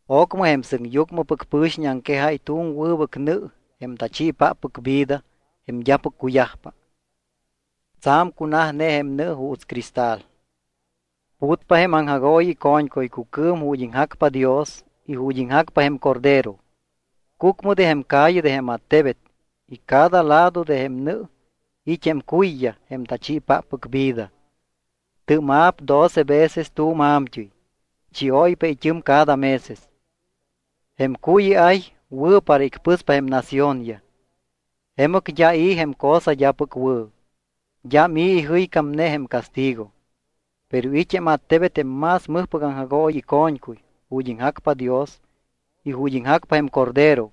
Ocmɨ jém sɨŋyucmɨpɨc pɨ̱xiñ aŋquejáy tu̱m wɨbɨc nɨ jém tachiipáppɨc vida jém d́apɨc cuyajpa. Tsa̱m cunajne jém nɨ juuts cristal. Putpa jém aŋjagooyi ico̱ñcuycucɨɨm ju̱t́ iŋjacpa Dios y ju̱t́ iŋjacpa jém Cordero. Cucmɨ de jém calle de jém attebet y cada lado de jém nɨ it́ jém cuyyaj jém tachiipáppɨc vida. Tɨ́ma̱p doce veces tu̱m a̱mt́ɨy. Chióypa it́ɨm cada meses. Jém cuy iay wɨ̱ para icpɨspa jém naciónyaj. Jemɨc d́a i̱ jém cosa d́apɨc wɨ̱, d́am i̱ ijɨycámne jém castigo. Pero it́ jém attebet jém más mɨjpɨc aŋjagooyi ico̱ñcuy ju̱t́ iŋjacpa Dios y ju̱t́ iŋjacpa jém Cordero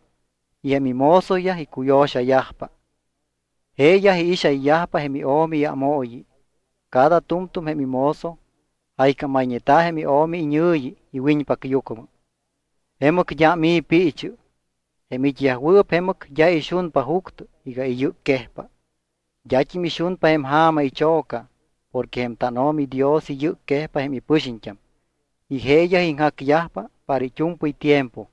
y jém imozoyaj icuyo̱xayajpa. Jeeyaj iixayyajpa jém iO̱mi iámooyi. Cada tu̱mtu̱m jém imozo jaycámayñeta̱ jém iO̱mi iñɨ̱yi iwiñpacyucmɨ. Jemɨc d́am i̱ piichɨ. Jém it́yajwɨɨp jemɨc d́a ixunpa juctɨ iga iyɨcquejpa. D́at́im ixunpa jém ja̱ma icho̱ca porque jém tánO̱mi Dios iyɨcquejpa jém ipɨxiñt́am y jeeyaj iŋjacyajpa para it́u̱mpɨy tiempo.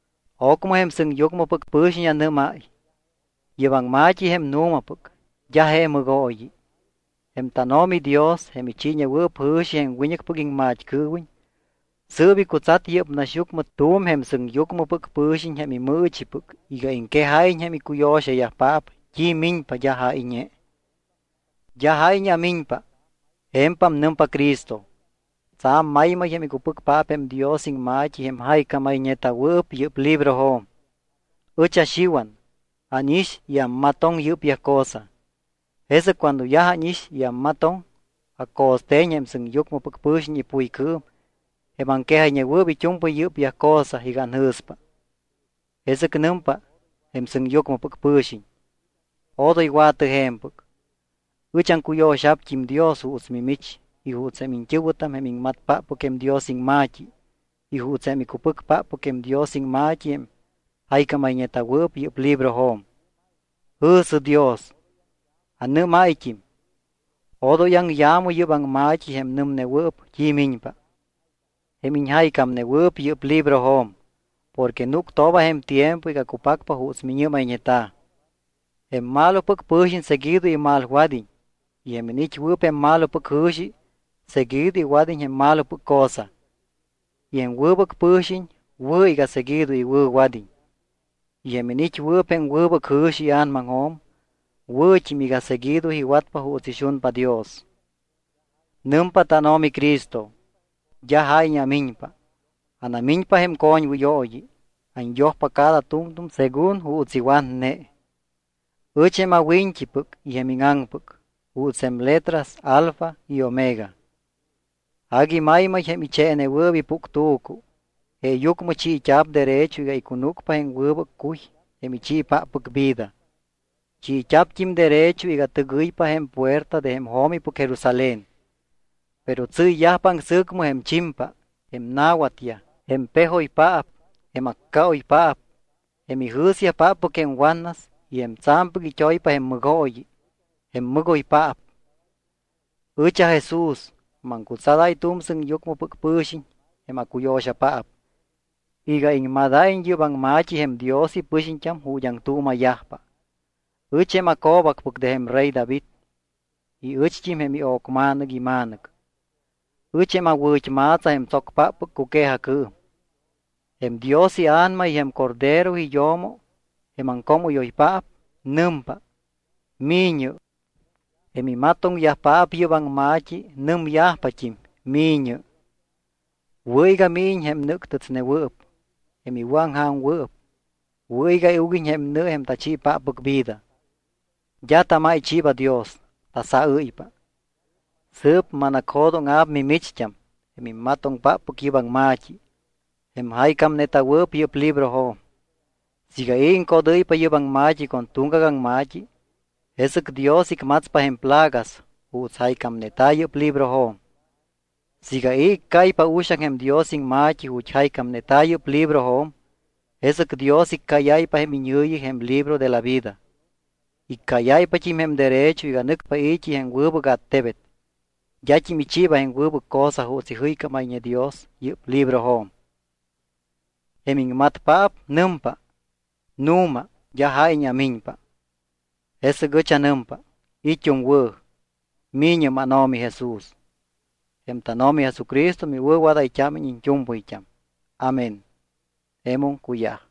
Ocmɨ jém sɨŋyucmɨpɨc pɨ̱xiñ anɨ́máy: —Yɨ́p aŋma̱t́i jém nu̱mapɨc. D́a je mɨgooyi. Jém tánO̱mi Dios, jém ichiiñewɨɨp jɨ̱xi jém wiñɨcpɨc iŋmat́cɨɨwiñ, sɨɨp icutsat yɨ́p naxyucmɨ tu̱m jém sɨŋyucmɨpɨc pɨ̱xiñ jém imɨɨchipɨc iga iŋquejáyiñ jém icuyo̱xayajpaap t́i miñpa d́a jáyñe. —D́a jáyñe amiñpa. Je̱mpam nɨmpa Cristo. Tsa̱m maymay jém icupɨcpaap jém Dios iŋma̱t́i jém jaycámayñeta̱wɨɨp yɨ́p librojo̱m. Ɨch aXiwan. Ánix y ammatoŋ yɨ́pyaj cosa. Jesɨc cuando yaj ánix y ammatoŋ, aco̱ste̱ñ jém sɨŋyucmɨpɨc pɨ̱xiñ ipuycɨɨm jém aŋquejayñewɨɨp it́u̱mpɨy yɨ́pyaj cosa iga anjɨ̱spa. Jesɨc nɨmpa jém sɨŋyucmɨpɨc pɨ̱xiñ: —Odoy wa̱tɨ je̱mpɨc. Ɨch aŋcuyo̱xa̱pt́im Dios juuts mimich y juuts jém iñt́ɨ̱wɨtam jém iŋmatpáppɨc jém Dios iŋma̱t́i y juuts jém icupɨcpáppɨc jém Dios iŋma̱t́i jém jaycámayñeta̱wɨɨp yɨ́p librojo̱m. Jɨ̱sɨ Dios. Anɨ́máyt́im: —Odoy aŋya̱mɨ yɨ́p aŋma̱t́i jém nɨmnewɨɨp t́i miñpa, jém iñjaycámnewɨɨp yɨ́p librojo̱m, porque núctooba jém tiempo iga cupacpa juuts miñɨ́mayñeta̱. Jém malopɨc pɨ̱xiñ seguido imalwad́iñ y jém iniit́wɨɨp jém malopɨc jɨ̱xi seguido iwad́iñ jém malopɨc cosa. Y jém wɨbɨc pɨ̱xiñ wɨ̱ iga seguido iwɨ̱wad́iñ. Y jém iniit́wɨɨp jém wɨbɨc jɨ̱xi ia̱namaŋjo̱m wɨ̱t́im siiga seguido iwatpa juuts ixunpa Dios. Nɨmpa tánO̱mi Cristo: —D́a jáyñe amiñpa. Anamiñpa jém coñwɨyooyi. Anyojpa cada tu̱mtu̱m según juuts iwatne. Ɨch jém awiñt́ipɨc y jém íŋaŋpɨc, juuts jém letras alfa y omega. Agui maymay jém icheenewɨɨp ipuctu̱cu. Jeeyucmɨ chiit́a̱p derecho iga icunúcpa jém wɨbɨc cuy jém ichiipáppɨc vida. Chiit́a̱pt́im derecho iga tɨgɨypa jém puerta de jém jo̱mipɨc Jerusalén. Pero tsɨ́yyajpa aŋsɨ̱cmɨ jém chimpa, jém na̱watyaj, jém pejoypaap, jém accaoypaap, jém ijɨ̱spáppɨc jém watnas y jém tsa̱mpɨc it́oypa jém mɨgooyi, jém mɨgoypaap. —Ɨch aJesús. Maŋcutsadáy tu̱m sɨŋyucmɨpɨc pɨ̱xiñ, jém acuyo̱xapaap, iga iŋmadáyiñ yɨ́p aŋma̱t́i jém Dios ipɨxiñt́am ju̱t́ aŋtuuma̱yajpa. Ɨch jém aco̱bacpɨc de jém rey David y ɨcht́im jém io̱cma̱nɨc ima̱nɨc. Ɨch jém awɨ̱t́ma̱tsa jém tsocpáppɨc cuque̱jacɨɨm. Jém Dios iA̱nama y jém Cordero iyo̱mo, jém aŋcoomɨ́yoypaap, nɨmpa: ¡Mi̱ñɨ! Jém imatoŋyajpaap yɨ́p aŋma̱t́i nɨmyajpat́im: ¡Mi̱ñɨ! Wɨ̱ iga míñiñ jém nɨ́ctɨtsnewɨɨp. Jém iwɨ̱aŋja̱mwɨɨp, wɨ̱ iga iuguiñ jém nɨ jém tachiipáppɨc vida. D́a tamáychiiba Dios, tasajɨ́ypa. Sɨɨp manacjo̱dóŋa̱p mimicht́am, jém immatoŋpáppɨc yɨ́p aŋma̱t́i, jém jaycámneta̱wɨɨp yɨ́p librojo̱m. Siiga i̱ iŋcodɨ́ypa yɨ́p aŋma̱t́i con tuŋgac aŋma̱t́i, jesɨc Dios icmatspa jém plagas juuts jaycámneta̱ yɨ́p librojo̱m. Siiga i̱ iccáypa uxaŋ jém Dios iŋma̱t́i ju̱t́ jaycámneta̱ yɨ́p librojo̱m, jesɨc Dios iccáyáypa jém iñɨ̱yi jém libro de la vida. Iccáyáypat́im jém derecho iga nɨcpa i̱t́i jém wɨbɨc attebet. D́at́im ichiiba jém wɨbɨc cosa juuts ijɨycámayñe Dios yɨ́p librojo̱m. Jém iŋmatpaap nɨmpa: —Nu̱ma, d́a jáyñe amiñpa. Jesɨc ɨch anɨmpa: It́um wɨ̱. ¡Mi̱ñɨ, mánO̱mi Jesús! Jém tánO̱mi Jesucristo miwɨ̱wadayt́ámiñ iñt́u̱mpɨyt́am. Amén. Jemum cuyaj.